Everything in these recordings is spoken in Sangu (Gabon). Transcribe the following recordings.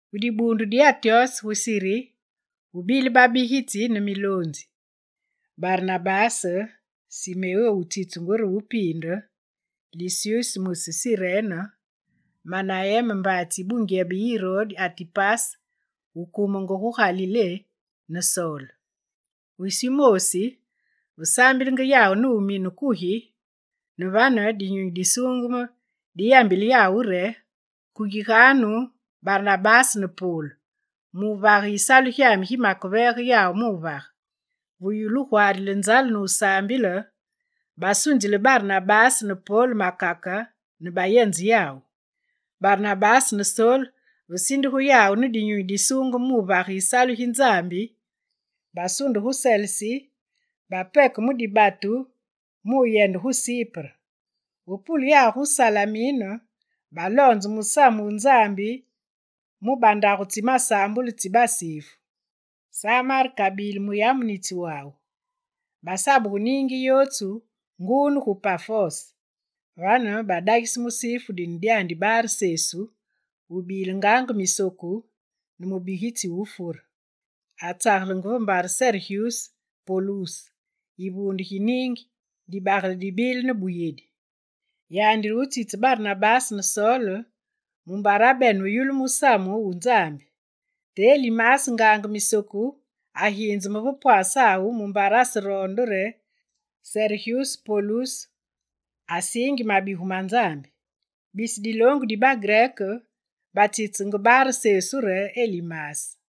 Gu dibuundu di Antyose gu Siri, gubile babigitsi ne miloonzi: Barnabase, Simeo wutsitsungu re Wupiinde, Lisyus mwisi Sirene, Manayene mbaatsi yi bungyebe yi Irode Atipase wukumenge gu Galilé, ne Sol. Wisi wumoosi, ve saambilenge yawu ne wunumine kugi, ne vane, Dinyunyi Disuungeme diyambile yawu re: «Kungiganu Barnabase ne Sol mu wuvage yisalu gi makeveege yawu mu wuvage.» Ve yulu wugwaarile nzale ne wusaambile, basunzile Barnabase ne Pol makake ne bayenze yawu. Barnabase ne Sol, ve sindugu yawu ne Dinyunyi Disuungeme mu wuvage yisalu gi Nzambi, basunde gu Selesi, bapeke mu dibatu muyende gu Sipre. Ve pule yawu gu Salamine, baloonze musamu wu Nzambi mu bandagu tsi masaambulu tsi basifu. Sa Mark abile muyamunitsi wawu. Basabugu niingi yootsu nguu ne gu Pafos. Vane badagise musifu dine dyandi Bar Sesu, wubile ngaange misoku ne mubigitsi wu wufure. Atsagelenge ve mbare Seregyuse Poluse yivuunde gi niingi, dibagele dibile ne buyedi. Yandi re wutsitsise Barnabase ne Sol, mumbare abene wuyulu musamu wu Nzambi. Te Elimase ngaange misoku aginzeme ve pwasawu mumbare aseroonde re Seregyuse Poluse asiingi mabigu ma Nzambi. Bisi diloongu di bagrek batsitseenge Bar Sesu re Elimase.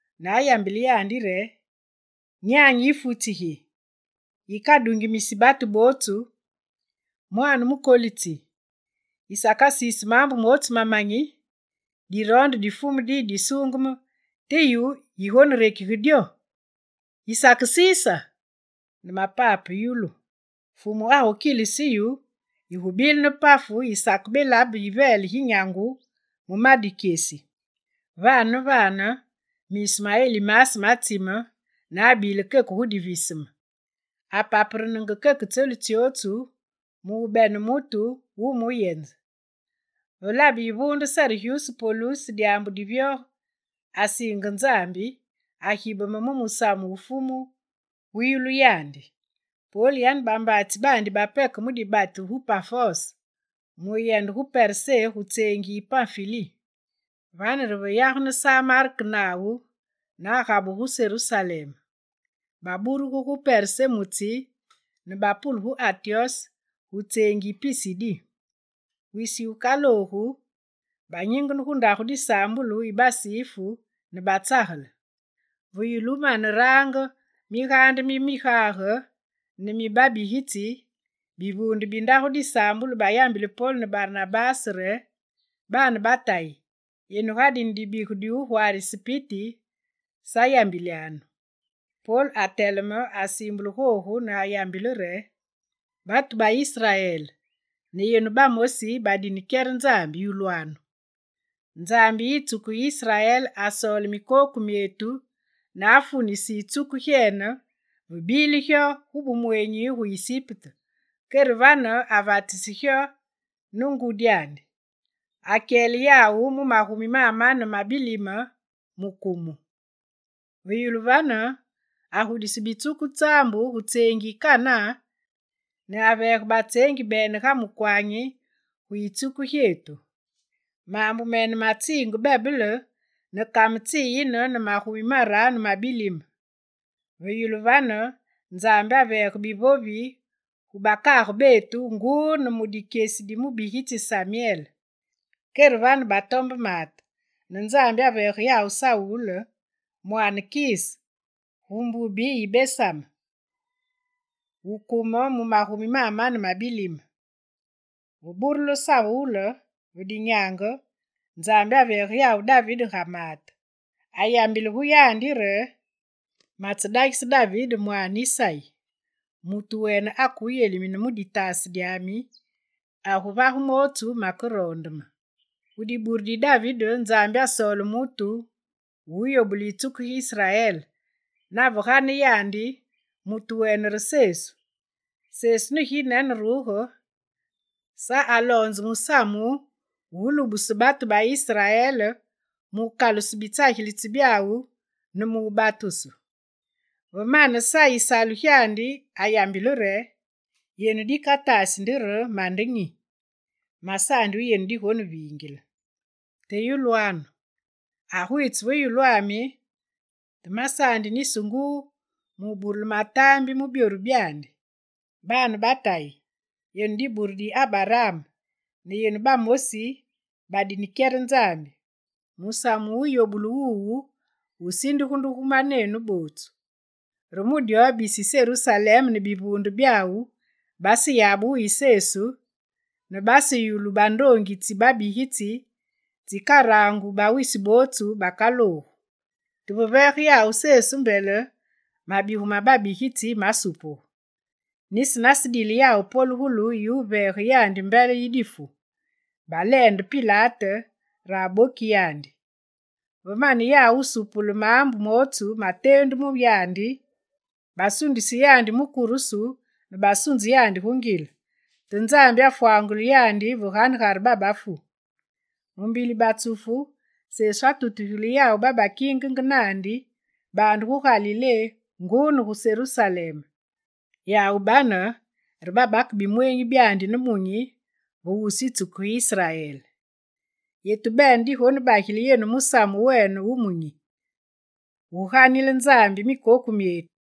ne ayambile yandi re: «Nyanyi yifutsi gi, yikadungimisi batu bootsu, mwaane mukolitsi, yisakaroondi maambu mootsu mamanyi! Diroonde di Fumu diyi disuungeme te yu yigonerekige dyo! Yisakesiisa! Ne mapape, yulu: Fumu agukilise yu, yigubile ne pafu ne yisakebelabe yiveele gi nyangu mu ma dikyesi.» Vane ne vane, miisu ma Elimase matsime ne abile keke gu diviseme: apaperenenge keke tselu tsyootsu mu bene mutu wumuyenze. Ve labe Yivuunde Seregyuse Poluse dyaambu divyoge, asiinge Nzambi, agibeme mu musamu wu Fumu wuyulu yandi. Pol yane bambaatsi baandi bapeke mu dibatu gu Pafos muyende gu Persé gu tseengi yi Panfili. Vane re ve yagene Sa Mark nawu ne agabuge gu Serusalem. Baburuge gu Persé mu tsi ne bapule gu Antyose gu tseengi yi Pisidi. Wisi wukaloogu, banyingene gu ndagu disaambulu yi basifu ne batsagele. Ve yulu wumane wurange migaande mi migage ne mi babigitsi, bivuunde bi ndagu disaambulu bayambile Pol ne Barnabase re: «Baane ba Tayi, yenu ga dine dibigu di wugwaarise piti, sa yambilyanu.» Pol ateleme, asiimbule googu ne ayambile re: «Batu ba Israel ne yenu bamosi badine kyere Nzambi, yulwanu! Nzambi yi yitsuku gi Israel, asoole mikoku myetu ne afunise yitsuku gyene ve bile gyo gu bumweenyi gu Isipte, kere vane avatise gyo ne ngudyandi. Akyele yawu mu magumi mamane ma bilime gu kumu. Ve yulu vane agudise bitsuku tsaambu gu tseengi yi Kanaan ne aveege batseengi bene ga mukwanyi gu yitsuku gyetu. Maambu mene matsinge bebele ne kame tsiyine ne magumi maraanu ma bilime. Ve yulu vane, Nzambi aveege bivovi gu bakaage betu nguu ne mu dikyesi di mubigitsi Samyele. Kere vane batombe maate, ne Nzambi aveege yawu Sawule, mwaane wu Kise, gu mbubi yi Besamin, wukume mu magumi mamane mabilime. Ve burulu Sawule ve dinyaange, Nzambi aveege yawu David ga maate. Ayambile mu yandi re: “Matsedagise David mwaane Isayi: mutu wene akewuyelimine mu ditaase dyami, aguvage mootsu makeroonde me.” Gu dibure di David Nzambi asoole mutu wu wuyobule yitsuku gi Israel, nave gane yandi; mutu wene re Sesu. Sesu ne gineneruge, Sa aloonzenge musamu wulubuse batu ba Israel mu wukaluse bitsagilitsi byawu ne mu wubatusu. Ve mane Sa yisalu gyandi ayambile re: “Yenu dikataasi nde re, mande nyi? Masaandi wu yenu digonevingile. Te yulwanu: Agwitse ve yulwami, te masaandi nisi nguu mu wuburule mataambi mu byoru byandi.” Baane ba Tayi, yenu dibure di Abaraam ne yenu bamosi badine kyere Nzambi, musamu wuyobulu wuwu wusindugu nde gu manenu. Re mu dyo, bisi Serusalem ne bivuunde byawu baseyabe wuyi Sesu, ne baseyulu bandoongi tsi babigitsi tsikarangu bawisi bootsu bakaloogu. Te ve veege yawu Sesu mbele, mabigu ma babigitsi masupugu. Nisi nasedile yawu polugulu yiwuveege yandi mbele yi difu, baleende Pilate re abokisi yandi. Ve mane yawu wusuupule maambu mootsu mateendu mu yandi, basundise yandi mu kurusu ne basunze yandi gu ngile. Te Nzambi afwangule yandi ve ganegare bafuumbi. Mu mbili batsufu, Sesu atutugile yawu babakingenge naandi baande gu Galilé nguu ne gu Serusalem; yawu bane re babake bimweenyi byandi ne munyi ve wusu yitsuku gi Israel. Yetu bene digonebagile yenu musamu wene wu munyi: wuganile Nzambi mikoku myetu.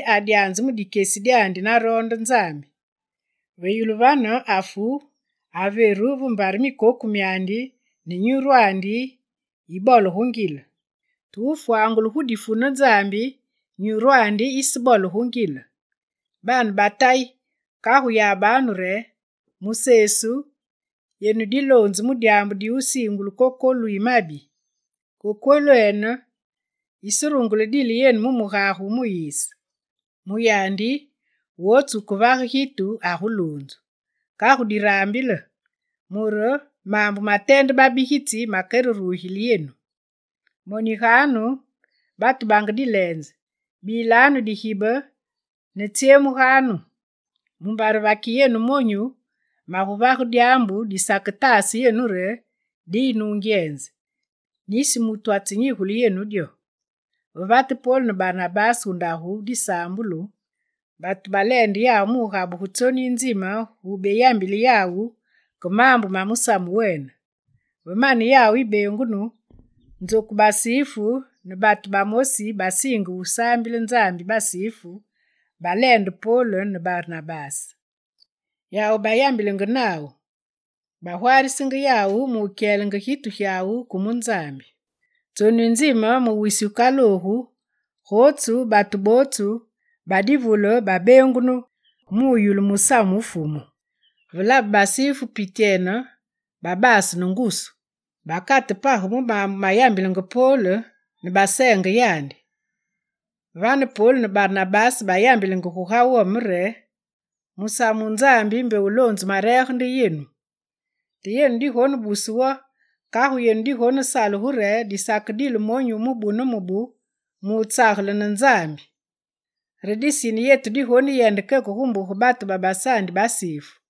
David, adyanze mu dikyesi dyandi naroonde Nzambi; ve yulu vane afu, averu ve mbare mikoku myandi ne nyurwandi yibole gu ngile. Te wufwangulu gu difu ne Nzambi, nyurwandi yisebole gu ngile. Baane ba Tayi kagu yabanu re: mu Sesu, yenu diloonzu mu dyaambu diwusiingulu kokolu yi mabi. Kokolwene, yiserungule wudile yenu mu mugage wu Muyise. Mu yandi, wootsu wukevage gitu aguluunzu. Kagu, diraambile, mure maambu mateende babigitsi makererugile yenu: “Moniganu, batu bange dileenze, bilanu digibe ne tsyemuganu! Mumbare vaki yenu monyu maguvage dyaambu disaketaase re diyi nungyenze, nisi mutu atsenyigule yenu dyo.”» Ve vate Pol ne Barnabase gu ndagu disaambulu, batu baleende yawu mu wugabuge tsonu yi nzime gubeyambile yawu ke maambu ma musamu wene. Ve mane yawu yibeengunu, nzoku basifu ne batu bamosi babasiinge wusaambile Nzambi basifu balaande Pol ne Barnabase. Yawu bayambilenge nawu, bagwaarisenge yawu mu wukyelenge gitu gyawu ke mu Nzambi. Tsonu yinzime mu wisi wukaloogu, gootsu batu bootsu ba divule babeengunu muyulu musamu wu Fumu. Ve labe basifu pityene, babase ne ngusu; bakate page mu maambu mayambilenge Pol, ne baseenge yandi. Vane Pol ne Barnabase bayambile guga wome re: «Musamu wu Nzambi mbe wuloonzu mareege nde yenu. Te yenu digonebuse wo, kagu yenu digonesalugu re, disakedile monyu wu mubu ne mubu mu wutsagele ne Nzambi! Re disine yetu diguyende keke gu mbuge babasaandi basifu.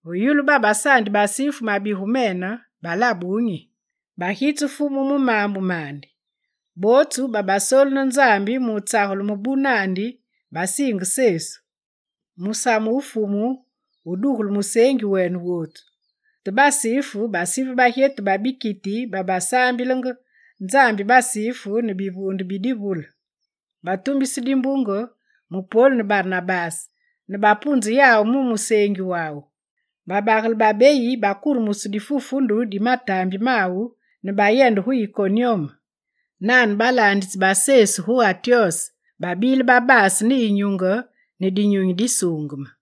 Ve yulu babasaandi basifu mabigu mene, balabe wunyi. Bagitse Fumu mu maambu mandi. Bootsu babasoolu ne Nzambi mu wutsagele mubu naandi, basiinge Sesu. Musamu wu Fumu wudugulu museengi wene wootsu. Te basifu basive bagyetu ba bikiti babasaambilenge Nzambi basifu ne bivuunde bi divule. Batumbise dimbunge mu Pol ne Barnabase, ne bapunze yawu mu museengi wawu. Babagele babeyi bakuremuse difufundu di mataambi mawu ne bayende gu Ikonyume. Nane, balaanditsi ba Sesu gu Antyose babile babase ne yinyunge, ne Dinyunyi Disuungeme.